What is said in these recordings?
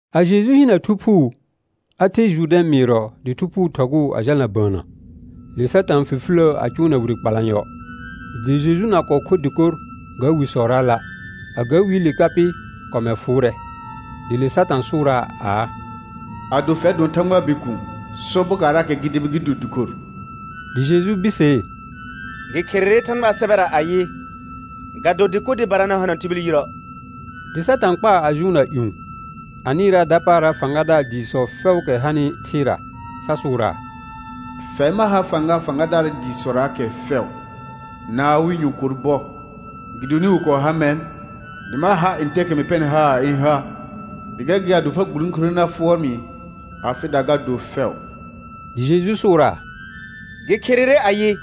A Jeju hinə Thu Phuu, a ther Jʋrdɛ̃ mɩɩrɔ, dɩ Thu Phuu thɔgʋʋ a jalna bəənnə. Le Satã fifiləə a cʋʋna wire kpalanyɔ. Dɩ Jeju na kɔɔ kho dɩkor ga wisɔraala'; a ga wiile ka pɩ kɔmɛr fʋʋrɛ. Dɩ le Satã sʋʋraa aa: Ado fɛr dʋɔn Thãgbaa Bikuun, sɔ bokaarraakɛ gɩ debi gɩ do dɩkor. Dɩ Jeju birsee: Gɩ kherere Thãgbaa sɛbɛra ayɩ: «Ga do dɩkor dɩbara na hana tibil yirə'.» Dɩ Satã kpaa a jʋʋnna ƴũ, a nɩɩraa dapaara fãgadaar dɩɩsɔ fɛʋʋkɛ hanɩ thɩɩra, sa sʋʋraa: Fɛr ma ha fãga fãgadaar dɩɩsɔraakɛ fɛʋ na awɩ nyɔ̃kor bɔ, gɩdonɩ wɩ kɔɔ ha mɛr, dɩ ma har ntɛɛkɛ mɩ pɛrnɩ haar ɩ̃ ha. Dɩ gɛr gɩ ado fa gburõkure na fʋɔr mɩ, afɩda ga do fɛʋ. Dɩ Jeju sʋʋraa: Gɩ kherere ayɩ: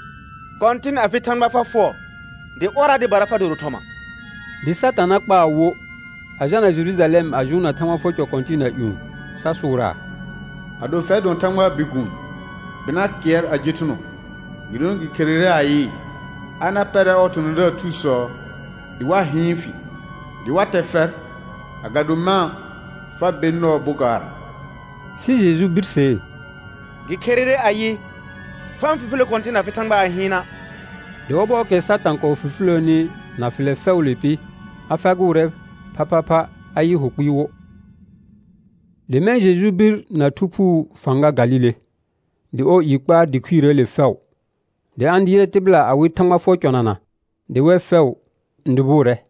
«Kɔ̃tɩn, afɩ Thãgba fa fʋɔr, dɩ ɔrra dɩbara fa doro thɔma.» Dɩ Satana kpaa wo, a jalna Jerujalɛm a jʋʋnna Thãgba fʋɔr cɔ kɔ̃tɩɩna ƴũ, sa sʋʋraa: Ado fɛr dʋɔn Thãgbaa Bikuun, bɩna kɩɛr a je thʋnɔ, gɩdonɩ gɩ kherere ayɩ: «A na pɛrɛ ɔɔ thɔ̃thɔ̃daar thusɔ dɩ wa hɩɩn fɩ» dɩ «wa tɛ fɛr, agado mã' fa ber nɔɔ bokaarra.» Sɩ Jeju birsee: Gɩ kherere ayɩ: «Fa-n fifilə Kɔ̃tɩn afɩ Thãgba a hɩɩna'.» Dɩ ɔbɔɔkɛ Satã kɔɔ fifiləəni na fɩlɛ fɛʋʋle pɩ, a fagʋʋrɛ phaphapha a yɩ hʋ kpɩɩ wo. Dɩ mɛ̃ Jeju bir na Thu Phuu fãga Galile, dɩ ɔɔ i kpaar dɩ khuirəəle fɛʋ. Dɩ a-n dɩɩrɛ tɩbɩla awɩ Thãgba fʋɔr cɔnana, dɩ wɛr fɛʋ n dʋbʋʋrɛ.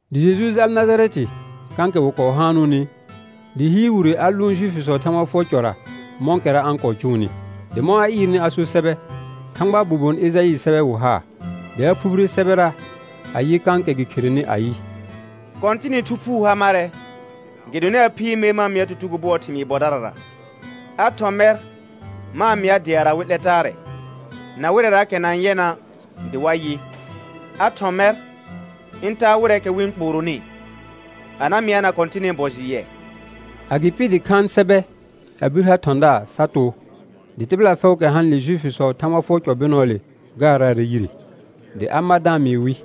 Dɩ Jeju jal Najarɛtɩ kãkɛ wɩ kɔɔ haanʋʋnɩ; dɩ hɩɩr wire a lʋʋn Juifisɔɔ Thãgba fʋɔr cɔra mɔ̃kɛra a-n kɔɔ cʋʋnɩ. Dɩ mɔ̃ a ɩɩrnɩ a so sɛbɛ, Thãgbaa bobon Ejaɩɩ sɛbɛ wɩ haa. Dɩ a phubire sɛbɛra a yɩ kãkɛ gɩ kherenɩ ayɩ: «Kɔ̃tɩnɩ Thu Phuu ha marɛ, gɩdonɩ a phiir mer ma-n mɩa tutugo bʋɔɔ thɩmɩɩ bɔdarara. A thɔ̃ mɛr ma-n mɩa deara wɩ 'lɛ taarɛ, na wɩrɛraakɛ na-n yɛna' dɩ wa yɩ. A thɔ̃ mɛr ɩ̃ taa wɩrɛɛkɛ wɩ-n kpooronɩ, a na mɩana Kɔ̃tɩnɩ bɔ jɩ yɛ.» Agɩpɩ dɩ khaan sɛbɛ a bir ha thɔ̃daar sa too. Dɩ tɩbɩla fɛʋʋkɛ hanɩle Juifisɔɔ Thãgba fʋɔr cɔ bɩnɔɔle gaaraarɛ yire. Dɩ a mar da-n mɩɩ wɩ: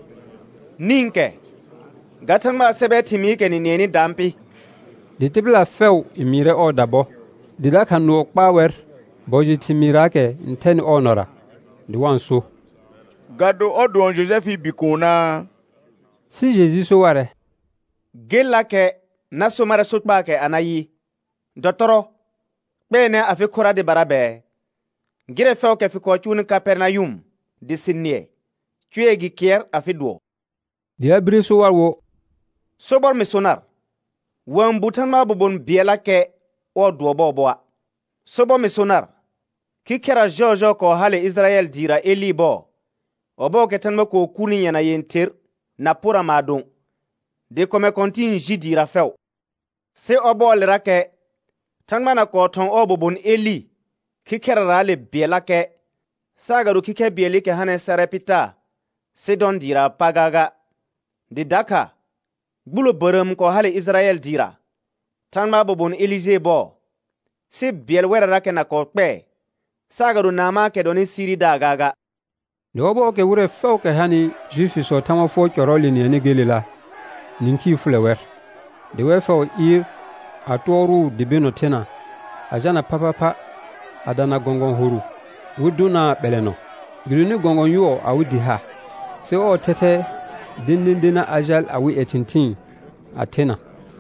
Nĩkɛ ga Thãgbaa sɛbɛ thɩmɩɩkɛ nɩ nɩɛnɩ daan pɩ. Dɩ tɩbɩla fɛʋ n mɩɩrɛ ɔɔda bɔ, dɩ dakha nʋɔ kpaa wɛr bɔ jɩ thɩmɩɩraakɛ n thɛnɩ ɔɔ nɔra, dɩ wa-n so: Ga do ɔr dʋɔn Jojɛfɩɩ bikuunaa? Sɩ Jeju so warɛ: Gellakɛ na so marɛ sokpaakɛ anayɩ: Dɔtɔrɔ, kpɛɛnɛ afɩ khora dɩbara bɛɛ, gɩrɛ fɛʋʋkɛ fɩ kɔɔ cʋʋnɩ Kapɛrnayʋm dɩ sɩ nɩɛ, cʋɛ gɩ kɩɛr afɩ dʋɔ. Dɩ a bire so war wo: Sobɔr mɩ so nar, wa-n bu Thãgbaa bobon bɩɛllakɛ ɔɔ dʋɔ bɔɔbɔa'. Sobɔr mɩ so nar: Khikhɛra jɔɔjɔɔ kɔɔ hale Ɩjɩrayɛl dɩɩra Elɩɩ bɔɔ, ɔbɔɔkɛ thãgba kɔɔ kurni yɛna yẽther na pora maadõ, dɩ kɔmɛ kɔ̃tɩ̃ɩ ji dɩɩra fɛʋ. Sɩ ɔbɔɔlerakɛ Thãgba na kɔɔ thɔ̃ ɔɔ bobon Elɩ khikhɛraraale bɩɛllakɛ, saagado khikhɛr bɩɛlɩkɛ hanɩ Sarɛpɩta Sɩdɔ̃ dɩɩraa pa gaaga. Dɩ dakha gbulo bərəəm kɔɔ hale Ɩjɩrayɛl dɩɩra Thãgbaa bobon Elijee bɔɔ, sɩ bɩɛl wɛrrarakɛ na kɔɔ kpɛɛ, saagado Naamãakɛ dɔnɩ Siridaar gaaga. Dɩ ɔbɔɔkɛ wɩrɛ fɛʋʋkɛ hanɩ Juifisɔɔ Thãgba fʋɔr cʋɔrɔɔle nɩɛnɩ gelela, nĩkhii fʋlɛ wɛr. Dɩ wɛr fɛʋ ɩɩr a tʋɔrʋʋ dɩ bɩnɔ thena, a jalna phaphapha a dana gɔ̃gɔ̃ horʋ wɩ dʋnaa ɓɛlɛnɔ, gɩdonɩ gɔ̃gɔ̃ yʋɔ awɩ dɩ ha. Sɩ ɔr thɛthɛ dẽdẽdena a jal awɩ ƴɛ thɩ̃thɩɩn a thena.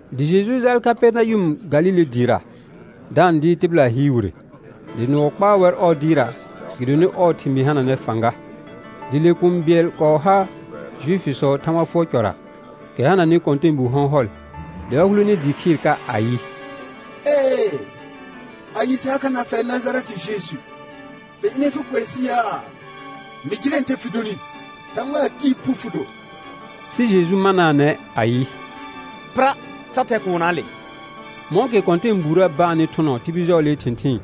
Dɩ Jeju jaal Kapɛrnayʋm Galile dɩɩra, da-n dɩɩr tɩbɩla hɩɩr wire. Dɩ nʋɔ kpaa wɛr ɔɔ dɩɩrra gɩdonɩ ɔɔ thɩmɩɩ hananɛ fãga. Dɩ le kũu bɩɛl kɔɔ ha Juifisɔɔ Thãgba fʋɔr cɔra, kɛ hananɩ kɔ̃tɛɛbu hɔ̃hɔl, dɩ a hulene dɩɩ khɩɩr ka ayɩ: Ee, anye sɩ ha kha na fɛr Najarɛtɩ Jeju? Fɩ ɩnɛ fɩ kʋɛ sɩ yaa? Mɩ jɩrɛ ntɛ fɩ donɩ: Thãgbaa Tɩɩ phu fɩ do. Sɩ Jeju manaanɛ ayɩ: Pɩra, sa thɛ kuunnaale. Mɔ̃kɛ kɔ̃tɛɛbuurə baanɩ thʋnɔ tibil jɔɔlee thɩ̃thɩɩn,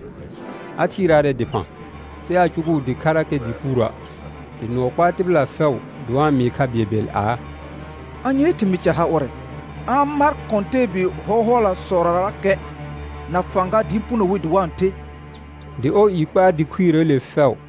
a thɩɩraarɛ dɩphã, sɩ aa cʋgʋʋ dɩkharakɛ dɩɩ puurə'. Dɩ nʋɔ kpaa tɩbɩla fɛʋ dɩ wa-n mɩɩ kha bɩɛlbɩɛl aa: Anyee thɩmɩɩ ca ha ʋrɛ? A-n mar kɔ̃tɛɛbi hɔ̃hɔlasɔrarakɛ na fãga dɩ puno wi dɩ wa-n the. Dɩ ɔɔ i kpaar dɩ khuirəəle fɛʋ.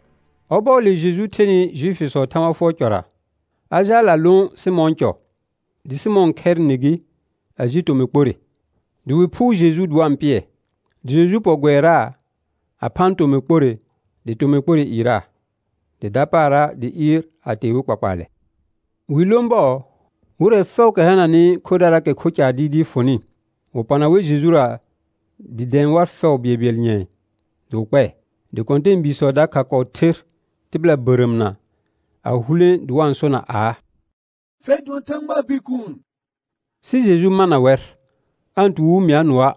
Ɔbɔɔle Jeju thenɩ Juifisɔɔ Thãgba fʋɔr cɔra, a jaal a lõ Sɩmɔ̃ɔ cɔ. Dɩ Sɩmɔ̃ɔ khɛrɩ nɩ gɩ, a ji tomɩ kporre, dɩ wɩ phʋʋr Jeju dɩ wa-n pɩɛ. Dɩ Jeju pɔ gʋɛraa a phaan tomɩ kporre, dɩ tomɩ kporre ɩɩraa. Dɩ dapaara dɩ ɩɩr a tee wɩ kpakpaalɛ. Wi lõ bɔɔ, wɩrɛ fɛʋʋkɛ hananɩ khodaraakɛ kho caar dɩɩdɩɩ fʋnɩ, wɩ pɔna wɛr Jejura dɩ dɛ̃ɛ war fɛʋ bɩɛlbɩɛl nyɛ̃ɛ, dɩ wɩ kpɛɛ. Dɩ kɔ̃tɛɛbiisɔ dakha kɔɔ ther tɩbɩla bərəəmna, a hulẽ dɩ wa-n sona aa: Fɛr dʋɔn Thãgbaa Bikuun. Sɩ Jeju mana wɛr, aa-n tu wɩ mɩa nʋɔa',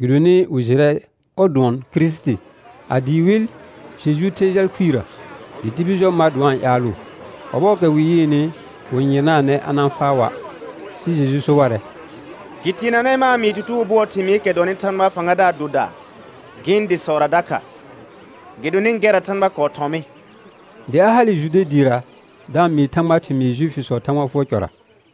gɩdonɩ wɩ jɩrɛ ɔr dʋɔn Kirisiti. A dɩɩ wɩl Jeju ther jal khuirə, dɩ tibil jɔ mar dɩ wa-n ƴaalʋʋ. Ɔbɔɔkɛ wɩ yɩɩnɩ, wɩ-n yɩrnaanɛ a na-n faa wa'. Sɩ Jeju so warɛ: Gɩ teenanɛ ma-n mɩɩ tutugo bʋɔɔ thɩmɩɩkɛ dɔnɩ Thãgbaa fãgadaar doda gɩ̃ dɩsɔra dakha, gɩdonɩ gɛrra Thãgba kɔɔ thɔ̃ mɩ. Dɩ a hale Jude dɩɩra da-n mɩɩ Thãgbaa thɩmɩɩ Juifisɔɔ Thãgba fʋɔr cɔra.